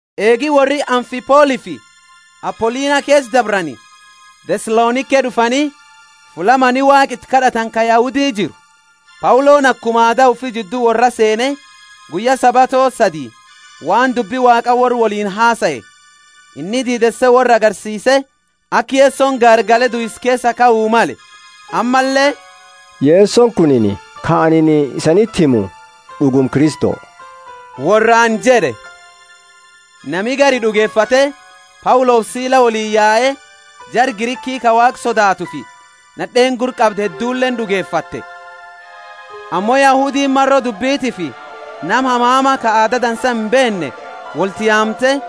Eegi worri Amfipolifi Apolinia keesa dabrani, Thesalonike d'ufani, fulla mani Waaqa iti kad'atani ka Yahudi jiru. Pauloni akuma aada ufi jiddu worraa seene, guyya Sabato sadii waan dubbi Waaqa worra woliini hasae. Inni diideese worra agarsiise, aka Yesoni gaargale duisa keesaa kau male, ammalle, Yesoni kunini ka anini isaaniti himu d'uguma Kristo worraani jed'e. Nami gari d'ugefate, Paulofi Sila woliini yae; jara Griki ka Waaqa sodaatufi nad'eeni gurra qabdu hedduleeni d'ugefatte. Ammo Yahudiini maro d'iibitifi nama hamama, ka aada dansa imbeenne wolti yaamte,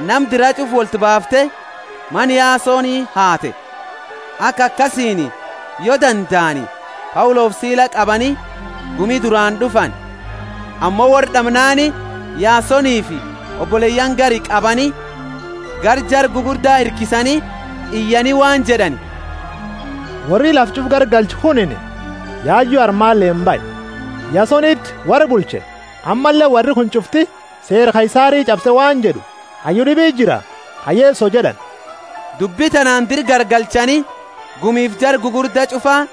nama dira ch'ufa wolti baafte mana Yasoni haate, aka akasiini yo dandaani, Paulofi Sila qabani gumi duraani d'ufani. Ammo worra d'amnaani Yasonifi oboleyaani gari qabani, gara jara gugurda hirkisani, iyani waan jed'ani, Worri lafa ch'ufa garagalche kunini yayu armaaleeni bahe, Yasoniti worra bulche. Ammalle worri kuni ch'ufti seera Kaisari ch'abse waan jed'u, Hayyu d'ibiti jira ka Yeso jed'ani. Dubbi tanaani dira garagalchani gumifi jara gugurda ch'ufa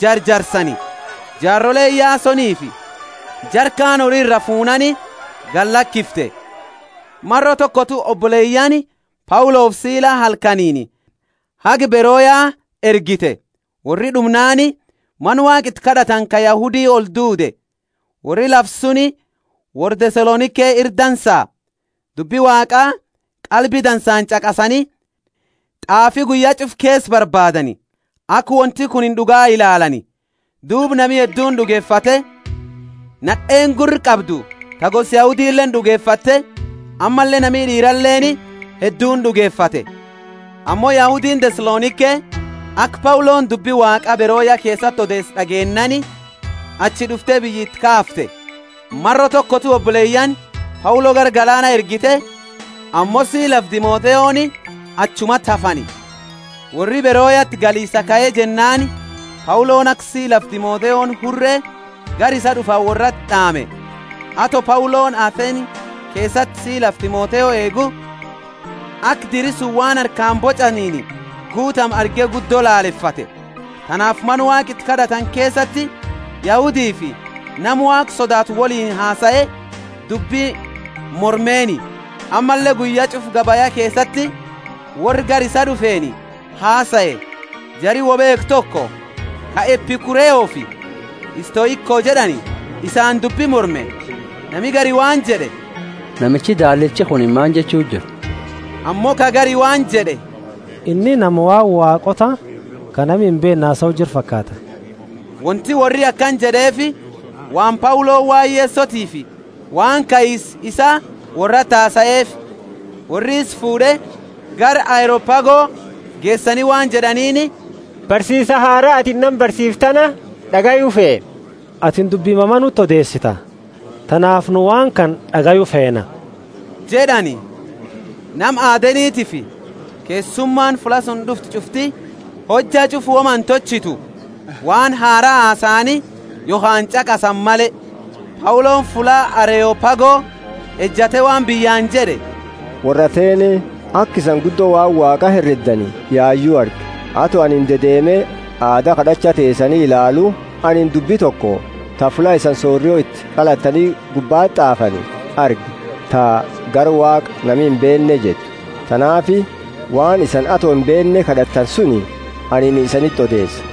jarjarsani. Jaaroleeni Yasonifi jara kaani hori iraa fuunaani galakifte. Maro tokotu oboleyaani Paulofi Sila halkaniini haga Beroya ergite. Worri d'umnaani mana Waaqa iti kad'atani ka Yahudi olduude. Worri lafa suni worra Thesalonike ira dansa. Dubbi Waaqa qalbi dansaani ch'aqasani, t'aafi guyya ch'ufa keesa barbaadani, aka wonti kunini d'uga ilaalani. Duuba nami hedduuni d'ugefate, nad'eeni gurra qabdu ta gosa Yahudileeni d'ugefate, ammalle nami d'iiraleeni, hedduuni d'ugefate. Ammo Yahudiini Thesalonike, aka Pauloni dubbi Waaqa Beroya keesati odeese d'ageennaani, achi d'ufte biyya iti kaafte. Maro tokotu oboleyaani Paulo gara galaana ergite, ammo Silafi Timotheoni achumati hafani. Worri Beroyati galisaa kae jennaani Pauloni aka Silafi Timotheoni hure gara isaa d'ufani worrati d'aame. Ato Pauloni Athene keesati Silafi Timotheo eegu, aka diri suni waan harkaani boch'aniini guutame arge guddo lalefate. Tanaafi mana Waaqa iti kad'atani keesati Yahudifi nama Waaqa sodaatu woliini hasae, dubbi mormeeni, ammalle guyya ch'ufa gabaya keesati worra gara isaa d'ufeeni hasae. Jari woi beekhu toko, ka Epikureofi Stoiko jed'ani, isaani dubbi morme. Nami gari waan jed'e, Namichi daallichi kunini maani jechu jira? Ammo ka gari waan jed'e, Inni nama waan waaqoota ka nami imbeenne hasau jiru fakaata. Wonti worri akana jed'eefi waan Pauloni waan Yesotiifi waan kaisa isaa worrati hasaeefi. Worri isa fuud'e, gara Areopago geesani waan jed'aniini, Barsiisa haraa atini nama barsiiftu tana d'agayu feena. Atini dubbi mama nuti odeesita, tanaafi nu waan kana d'agayu feena jed'ani. Nama Athentiifi keessumaani fulla suni d'ufte ch'ufti hojja ch'ufa woma intolchitu, waan haraa hasaani yokhaani ch'aqasani male. Pauloni fulla Areopago ejate waan biyyaani jed'e, Worra Athene, aka isani guddo waan Waaqa hereddani yayu arge. Ato anini dedeeme aada kad'acha teesani ilaalu, anini dubbi toko ta fulla isani sorio iti qalattani gubbati t'aafani arge, ta GARA WAAQA NAMI IMBEENNE jettu. Tanaafi waan isani ato imbeenne kad'attani suni anini isaniti odeesa.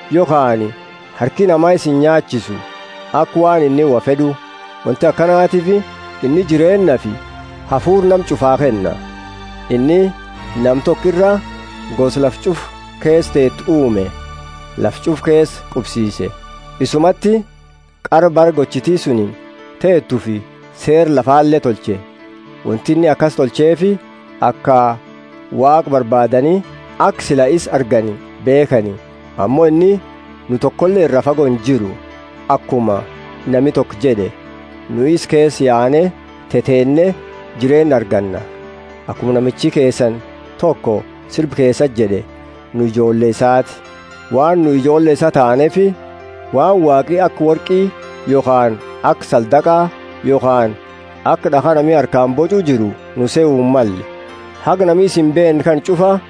Yokhaani harki nama isa inyaachisu, aka waan inni wo fed'u. Wonti akanatiifi inni jireennafi hafuura nama ch'ufaa kenna. Inni nama toko iraa gosa lafa ch'ufa keesa teetu uume, lafa ch'ufa keesa qubsise. Isumati qara bara gochiti suni teetufi seera lafale tolche. Wonti inni akasi tolcheefi, aka Waaqa barbaadani aka sila isa argani beekhani. Ammo inni nu tokole iraa fago injiru; akuma nami toko jed'e, Nu isa keesa yaane teteenne jireenna arganna. Akuma namichi keesani toko sirba keesa jed'e, nu ijoolle isaati. Waan nu ijoolle isaa taaneefi, waan Waaqi aka worqi yokhaani aka saldaqa yokhaani aka d'akha nami harkaani boch'u jiru nu sehu himmalle. Haga nami isa imbeenne kana ch'ufa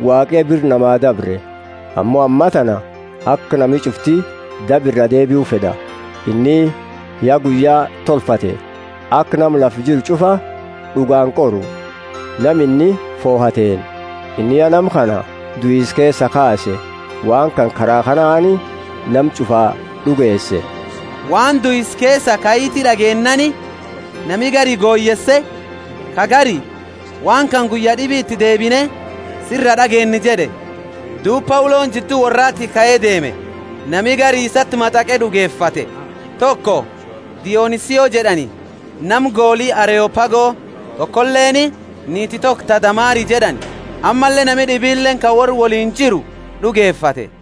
Waaqi ya bira namaa dabre, ammo ammatana aka nami ch'ufti daba iraa deebiu fed'a. Inni ya guyya tolfate, aka nama lafa jiru ch'ufa d'ugaani qoru, nama inni fohateeni. Inni ya nama kana duisa keesaa kaase, waan kana kara kanaani nama ch'ufaa d'ugeese. Waan duisa keesaa kaiti d'ageennaani, nami gari goyeese, ka gari, Waan kana guyya d'ibi iti deebine sira d'ageenna jed'e. Duuba Pauloni jiddu worraati kae deeme. Nami gari isati mataqe d'ugefate, toko Dionisio jed'ani, nama goli Areopago, tokoleeni niiti toko ta Damari jed'ani, ammalle nami d'ibileeni ka worra woliini jiru d'ugefate.